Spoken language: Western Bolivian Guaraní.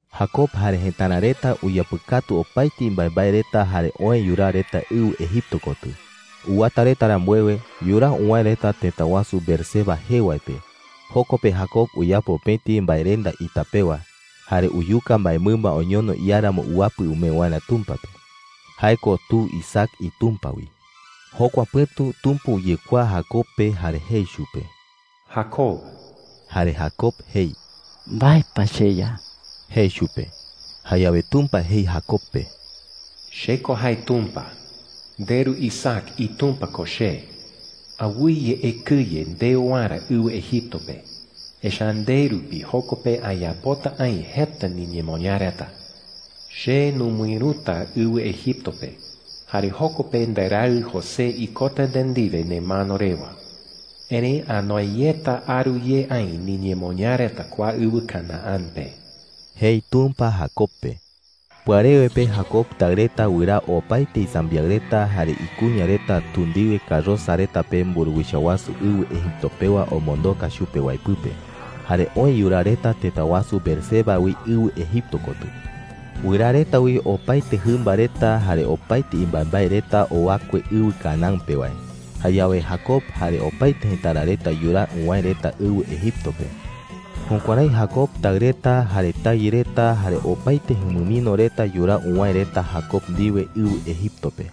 Jacob jare jëtara reta uyapɨkatu opaete imbaembae reta jare oë yuraa reta ɨwɨ Egipto kotɨ. Uwata reta rambuewe, yuraa uwäe reta tëta wasu Beerseba jee wae pe. Joko pe Jacob uyapo pëti mbaerenda ita pewa, jare uyuka mbaemɨmba oñono iáramo uapɨ umee waerä Tumpa pe – jae ko tu Isaac iTumpa wi. Jokua pɨ̈tu Tumpa uyekuaa Jacob pe jare jei chupe: “Jacob.” Jare Jacob jei: “¿Mbae pa, cheYa?” jei chupe. Jayawe Tumpa jei Jacob pe: “Che ko jae Tumpa. Nderu Isaac iTumpa ko che. Awɨye ekɨye ndeo waerä ɨwɨ Egipto pe, echa’ä nde rupi joko pe ayapota aï jeta niñemoñaa reta,” jei chupe. “Che numɨïruta ɨwɨ Egipto pe, jare joko pe nderaɨ José ikota nde ndiwe nemano rewa. Erëi anoe yeta aru ye aï niñemoñaa reta kua ɨwɨ Canaán pe,” jei Tumpa Jacob pe. Pɨarewe pe Jacob taɨ reta wɨraa opaete isambiaɨ reta jare ikuña reta tu ndiwe karosa reta pe mburuwicha wasu ɨwɨ Egipto pewa omondoka chupe wae pɨpe, jare oë yuraa reta tëta wasu Beerseba wi ɨwɨ Egipto kotɨ. Wɨraa reta wi opaete jɨmba reta jare opaete imbaembae reta owakue ɨwɨ Canaán pe wae. Jayawe Jacob jare opaete jëtara reta yuraa uwäe reta ɨwɨ Egipto pe. Jukuärái Jacob taɨ reta, jare tayɨ reta, jare opaete jumɨmino reta yuraa uwäe reta Jacob ndiwe ɨwɨ Egipto pe. (